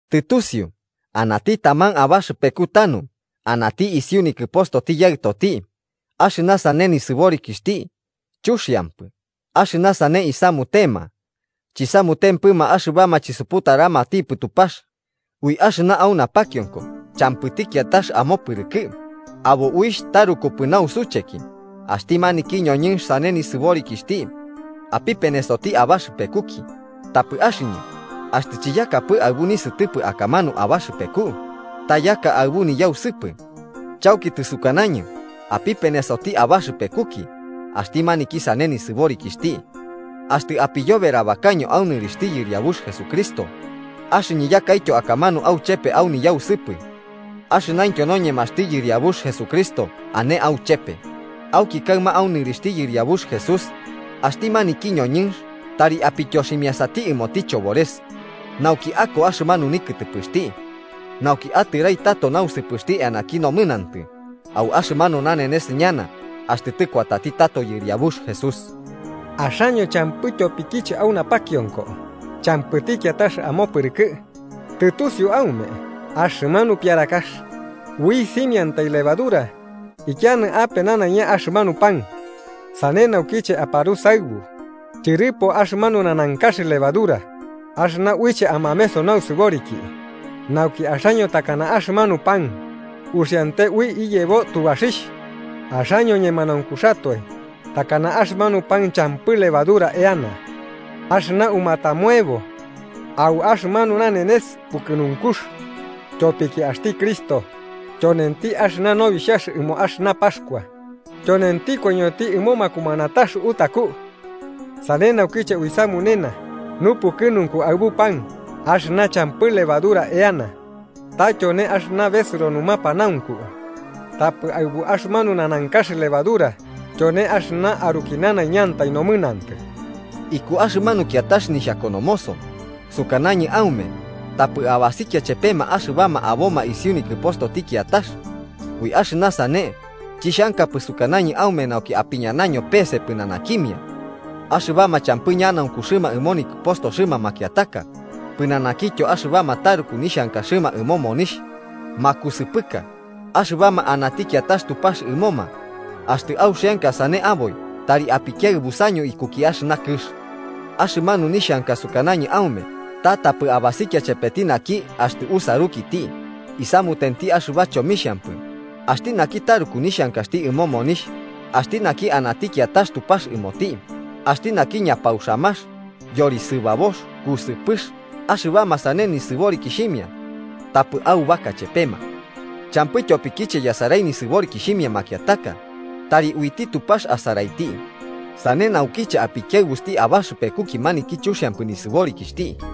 Tɨtusiu anati taman abaxɨpeku tanu ane isiuti nikɨpostoti yaɨtoti. Axɨna sane nisɨborikixhti chuxiampɨ, axɨna sane isamutema, chisamutempɨma axɨbama chisuputaramatipɨ Tupax. ¡Ui axɨna au napakionko champɨti kiatax amopɨrɨkɨ! ¡Abo uixh tarukupɨ nausucheki! Axti maniki ñoñɨnx sane nisɨborikixhti apipenesoti abaxɨpekuki. Tapɨ axɨñɨ, axtɨ chiyakapɨ aɨbu nisɨtɨpɨ akamanu abaxɨpeku, ta yaka aɨbu niyausɨpɨ. Chauki tɨsukanañɨ apipenesoti abaxɨpekuki axti maniki sane nisɨborikixhti. Axtɨ apiyoberabakaño au nɨrixhti Yɨriabux Jesucristo, axɨñɨ yakaityo akamanu auchepe au niyausɨpɨ, axɨnaintyo noñemaxti Yɨriabux Jesucristo ane auchepe. Auki kaɨma au nɨrixhti Yɨriabux Jesús, axti maniki ñoñɨnx tari apityoximiasati ɨmoti Chobores, nauki ako axɨmanu nikɨtɨpɨxti nauki atɨrai tato nausɨpɨxti eanaki nomɨnantɨ au axɨmanu nanenes ñana axtɨ tɨkuatati tato Yɨriabux Jesús. Axaño champɨ tyopikiche au napakionko champɨti kiatax amopɨrɨkɨ. Tɨtusiu aume axɨmanu piarakax: “Ui simiantai levadura ikianɨ ape nanaiña axɨmanu pan.” Sane naukiche aparusaɨbu tyɨrɨpo axɨmanu nanankax levadura axɨna uiche amameso nausɨboriki, nauki axaño takana axɨmanu pan uxiante ui iyebo tubaxixh. Axaño ñemanaunkuxatoe, takana axɨmanu pan champɨ levadura eana axɨna umatamoebo au axɨmanu nanenes Pukɨnunkux. Tyopiki axti Cristo, tyonenti axɨna Nobixhax ɨmo axɨna Paxkua, tyonenti koiñoti ɨmo makumanatax utaku. Sane naukiche uisamunena nupukɨnunku aɨbu pan axɨna champɨ levadura eana, ta tyone axɨna besɨro numapanaunku, tapɨ aɨbu axɨmanu nanankax levadura tyone axɨna aruki nanaiñantai nomɨnantɨ. Iku axɨmanu kiatax nixhakonomoso, sukanañɨ aume tapɨ abasikia chepema axɨbama aboma isiu nikɨpostoti kiatax. Ui axɨna sane chixhankapɨ sukanañɨ aume nauki apiñanaño pese pɨnanakimia axɨbama champɨ ñanaunkuxɨma ɨmo nikɨpostoxɨma makiataka, pɨnanakityo axɨbama taruku nixhankaxɨma ɨmo monixh, makusɨpɨka, axɨbama anati kiatax Tupax ɨmoma, axtɨ auxianka sane aboi tari apikiaɨbusaño ikuki axɨna kɨx. Axɨmanu nixhanka sukanañɨ aume ta tapɨ abasikia chepeti naki axtɨ usarukiti isamutenti axɨba chomixhampɨ, axti naki taruku nixhankaxti ɨmo monixh, axti naki anati kiatax tupax ɨmoti, axti naki ñapauxamax, yorisɨbabox, kusɨpɨx. Axɨbama sane nisɨborikixhimia, tapɨ aubaka chepema. Champɨ tyopikiche yasarai nisɨborikixhimia makiataka. Tari uiti Tupax asaraiti. Sane naukiche apikiaɨbusti abaxɨpekuki maniki chuxiampɨ nisɨborikixhti.